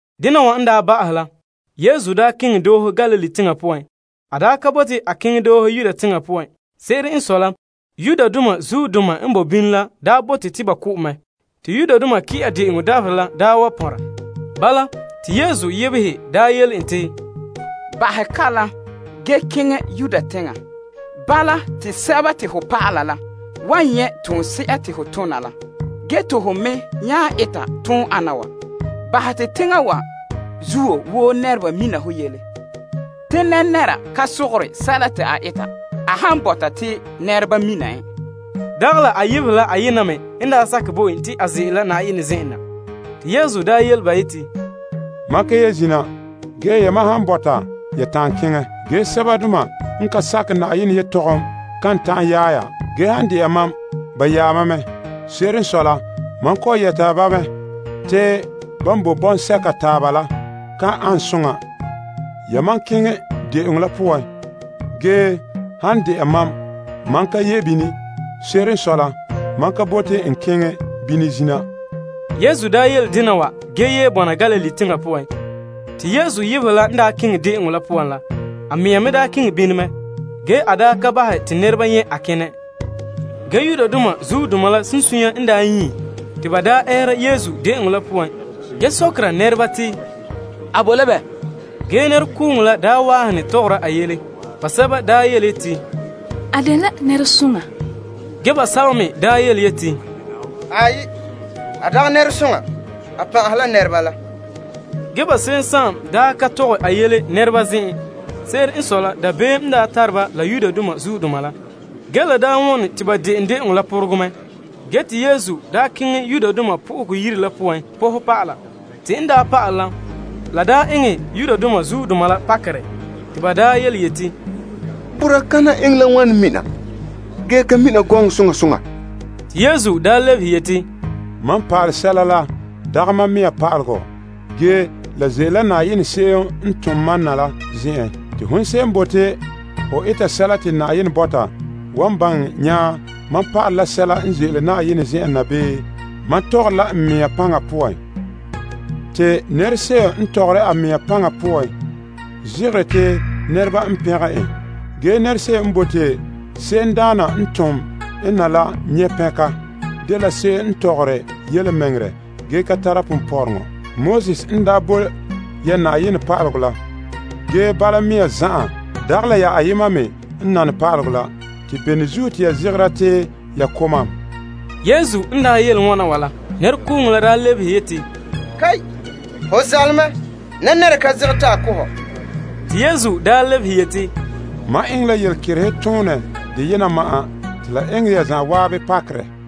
Dena wa n daa ba'ahɛ la, Yesu keŋɛ doohe la Galilee teŋa poan. A ka bote a keŋɛ doohe Yudea teŋa poan. Se'ere n sɔe la, Yudoma n boe bini la daa bote te ba ko' en mɛ. Te Yudoma Pagahe Tin'a De'eŋɔ dabaherɛ la daa wa pɔnrɛ. Bala, te Yesu yebehe yele en te, Bahɛ kalam ge keŋɛ Yuda teŋa. Bala, te ho dɔlɔba la wan nyɛ' toonse'a te ho tona la. Ge te hon me nya ete toon ana wa, bahɛ te teŋa wa zuo woo nɛreba mina ho yele. Te nɛra ka sogore sɛla te a eta a han bɔta te nɛreba mina en. Dagɛ la a yebehe la ayema me n daa sakɛ bo en te a ze'ele la Na'ayenɛ zen'en na. Te Yesu yele ba yeti, Mam ka ye zina, ge yamam han bɔta, ya ta'an keŋɛ. Ge sɛbadoma n ka sakɛ Yenɛ yelehom kan ta'an yaɛ ya. Ge, han de'a mam, ba yaɛ mam mɛ. Se'ere n sɔe la, mam kɔ'ɔn yɛta ba mɛ te ban boe bɔŋsɛka taaba la ka ane soŋa. Yamam keŋɛ de'eŋɔ la poan, ge han de'a mam, mam ka ye bini. Se'ere n sɔe la, saŋa la nan ka paɛ te n keŋɛ bini. Yesu yele dena ge ye bɔna Galilee teŋa poan. Te Yesu yebehe la n daa keŋɛ de'eŋɔ la poan la, a mea me keŋɛ bini mɛ. Ge, a ka bahɛ te nɛreba nyɛ' a kenɛ. Ge Yudoma la sunsunya n nyie te ba ɛɛra Yesu de'eŋɔ la poan, ge sɔkera nɛreba te, A boe la bɛ? Ge nɛrekooŋɔ la waahene tɔgɔra a yele. Basɛba yeti, A dela nɛresoŋa. Ge, basɛba me yeti, Aai, a dagɛ nɛresoŋa. A pan'ahe la nɛreba la. Ge, ba se'em ka tɔgɛ a yele peelomɛn. Se'ere n sɔe la, dabeem n tare ba la Yudoma la. Ge la daa wɔne te ba de'en de'eŋɔ la porogerɛ mɛ, ge te Yesu keŋɛ Yenɛ Yire la poan pɔhɛ pa'ala. Te en pa'ale la, la eŋɛ Yudoma la pakerɛ te ba yeti, Boraa kana eŋɛ la wane mina ge ka ba mina gɔŋɔ soŋa soŋa? Te Yesu lebehe yeti, Mam pa'ale sɛla n dagɛ mam mea pa'alegɔ. Ge, la ze'ele la Na'ayenɛ se'em n tom mam na la zen'en. Te hon se'em n bote ho eta sɛla te Na'ayenɛ bɔta, wan baŋɛ nya mam pa'alɛ sɛla la ze'ele la Na'ayenɛ zen'en na, bii mam tɔgɔre la n mea paŋa poan. Te nɛrese'em n tɔgɔre a mea paŋa poan, zegere te nɛreba n pɛngɛ en. Ge nɛrese'em n bote se'emdaana n tom en na la nyɛ' pɛnka, dela se'em n tɔgɔre yelemɛŋɛrɛ ge ka tara ponpɔrɔŋɔ. Moses n daa bo ya pa'alegɔ la. Ge, bala mea zan'an dagɛ la ya ayema me n nane pa'alegɔ la. Bene zuo te ya zegera te ya ko' mam? Yesu n daa yele wana wa la, nɛrekooŋɔ la lebehe yeti, Ho zaale mɛ. Nɛra ka zegɛre te a ko' hɔ. Te Yesu lebehe yeti, Mam eŋɛ la yelekeretoonɛ deyena ma'an te la eŋɛ ya zan'an pakerɛ.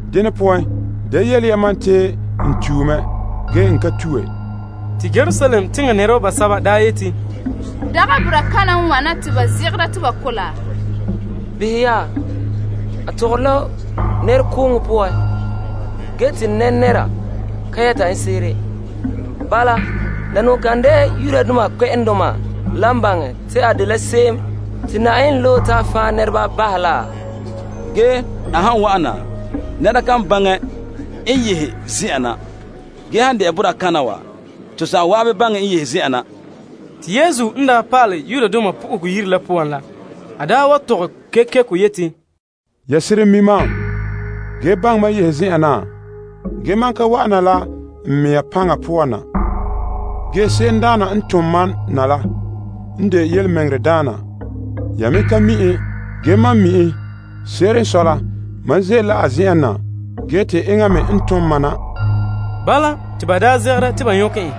Dene poan, da yele ya mam te n tue mɛ, ge n ka tue. Te Yerusalem teŋa nɛreba basɛba nya yeti, Dagɛ boraa kana n wana te ba zegɛra te ba ko' laa? Behɛ ya, a tɔgɔre la nɛrekooŋɔ poan, ge te nɛra ka yɛta en se'ere. Bala, la kan de'a Yudoma kpɛ'ɛndoma la baŋɛ te a dela se'em te Na'ayenɛ loe la? Ge, a han wa'ana, nɛra kan baŋɛ n yehe zen'an na. Ge han de'a boraa kana wa, to zan'an baŋɛ n yehe zen'an na. Te Yesu n pa'alɛ Yenɛ Yire la poan la, a tɔgɛ kekeko yeti, Ya seren mi' mam ge baŋɛ mam yehe zen'en naa? Ge, mam ka wa'an na la n mɛŋa paŋa poan na. Ge Se'emdaana n tom mam na la n de yelemɛŋɛrɛdaana. Ya me ka mi' en. Ge, mam mi' en. Se'ere n sɔe la, mam ze'ele la a zen'an na ge te enŋa me n tom mam na. Bala, te ba daa zegera te ba nyɔkɛ en.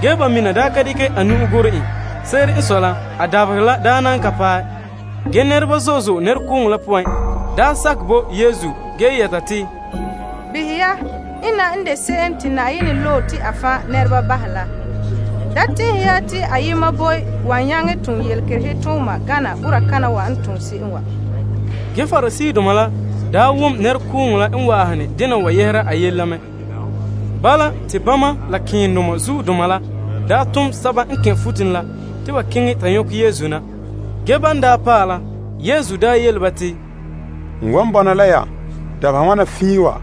Ge ba se'em ka dekɛ a nu'o gorɛ en. Se'ere n sɔe la, a dabaherɛ la na ka paɛ. Ge, nɛreba zo'e zo'e nɛrekooŋɔ la poan sakɛ bo Yesu, ge yɛta te, Behɛ ya, ena n de se'em te Yenɛ loe la. Da tɛn'ɛhe ya te ayema boe wan nyaŋɛ tom yelekerehe tooma gana boraa kana wa n tom se'em wa. Ge Pariseedoma la wom nɛrekooŋɔ la n waahene dena wa yɛhera a yele la mɛ. Bala, te bama la malema nɛŋadaana la tom guruba la te ba keŋɛ ta nyɔkɛ Yesu na. Ge, ban paɛ la, Yesu yele ba yeti, N wan bɔna la ya dabeha wana fiin wa,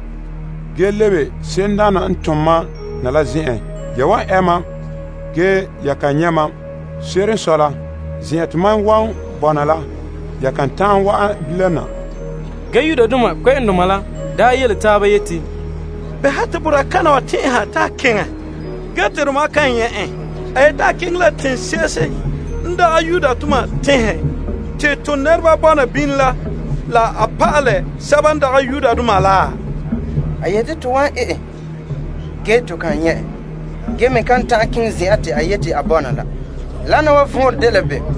ge lebe se'emdaana n tom mam na la zen'en. Ya wan ɛ mam, ge, ya kan nyɛ' mam. Se'ere n sɔe la, zen'an te mam wan bɔna la, ya kan ta'an wa'an bilam na. Ge Yudoma la nya yele taaba yeti, Bɛha te boraa kana wa tɛn'ɛha te a keŋɛ ge te tomam kan nyɛ' en? A yeti a keŋɛ la Greek teŋhe te to nɛreba bɔna bini la te a pa'ala Greekdoma la? A yeti to wan ɛ en, ge to kan nyɛ' en, ge me kan ta'an keŋɛ zen'en te a yeti a bɔna la. Wana wa vɔnrɛ dela bem?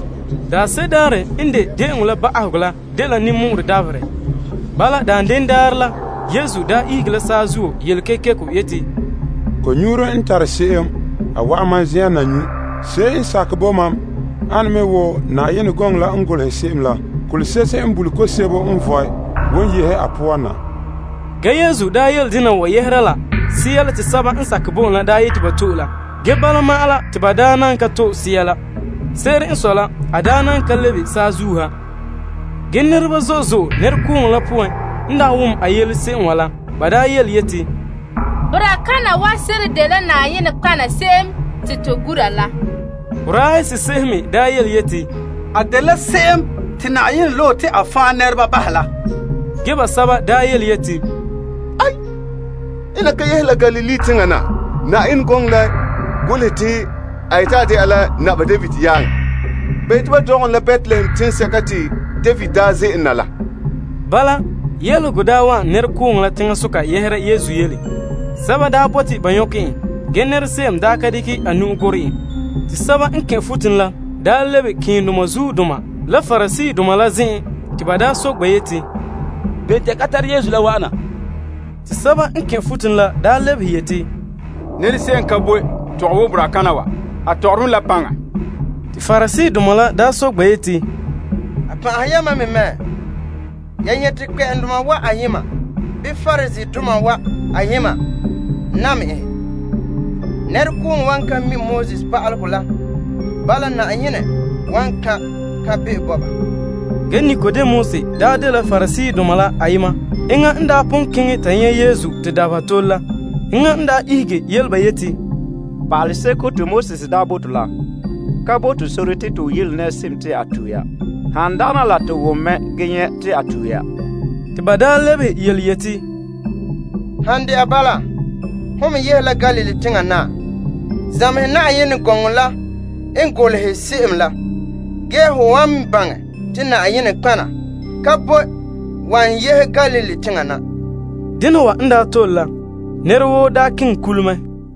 Daanse'ere daarɛ n de de'eŋɔ la ba'ahegɔ la dela ninmɔ'ɔrɛ dabaherɛ. Bala, daanden daarɛ la, Yesu daa ihege la saazuo yele kekeko yeti, Ko'nyuuro n tare se'em a wa'an mam zen'en na nyu'. Se'em n sakɛ bo wa'ana la a nyu' wo Yenɛ gɔŋɔ la n golehɛ se'em la, Kolese'ehe n bule ko'om sebo n vɔe wan yehe a poan na. Ge Yesu yele dena wa yɛhera la Sea la te sɛba n sakɛ bo en la yeti ba to'e la. Ge bala ma'an la, te ba na ka to'e Sea la. Se'ere n sɔe la, a nan ka lebe saazuo ha. Ge nɛreba zo'e zo'e nɛrekooŋɔ la poan n wom n yele se'em wa la, ba daa yeti, Boraa kana wa seren dela nɔtɔgɔha se'em te to gura la. Sɛba me yeti, A dela se'em te Na'ayenɛ loe la. Ge, basɛba yeti, Ena ka yehe Galilee teŋa na. Yenɛ gɔŋɔ la golehɛ te a yeti a de'a la Naba David yaaŋa te ba dɔgɛ en la Betlehem teŋsɛka te David daa ze'ele na. Bala, yelehego daa wa'an nɛrekooŋɔ la teŋasoka yɛhera Yesu yele. Sɛba bote ba nyɔkɛ en ge nɛrese'em ka dekɛ a nu'o gorɛ en. Te guruba la nya lebe malema keendoma la Pariseedoma la zen'en te ba soke ba yeti, Bene te ya ka tare Yesu la wa'ana? Te guruba la lebehe yeti, Nɛrese'em ka boe tɔgɛ wo boraa kana wa. A tɔgɔre me la paŋa. Te Pariseedoma la daa soke ba yeti, A pan'ahe yamam me mɛ? Ya nyɛ' te kpɛ'ɛndoma wa ayema, bii Pariseedoma wa ayema nam en? Nɛrekooŋɔ wa ka mi' pa'alegɔ pa'aleba la. Bala, Na'ayenɛ kan' la kan'be'o bahɛ ba zuo. Ge Nikodemus daa dela Pariseedoma ayema. Enŋa n daa pon keŋɛ ta nyɛ' Yesu te dabeha tole la. Enŋa n daa ihege yele ba yeti, Pa'alegɔ la bo to sore te to yele nɛrese'em a tue ya, han dagana to wom mɛ ge nyɛ' te a tue ya? Te ba lebehe yeti, Han de'a bala, hon me yehe la Galilee teŋa naa? Zamehɛ Yenɛ gɔŋɔ la n golehɛ se'em la, ge ho wan baŋɛ te nɔtɔgɔha ka boe wan yehe Galilee teŋa na. Dena wa n daa tole la, nɛra woo keŋɛ kule mɛ.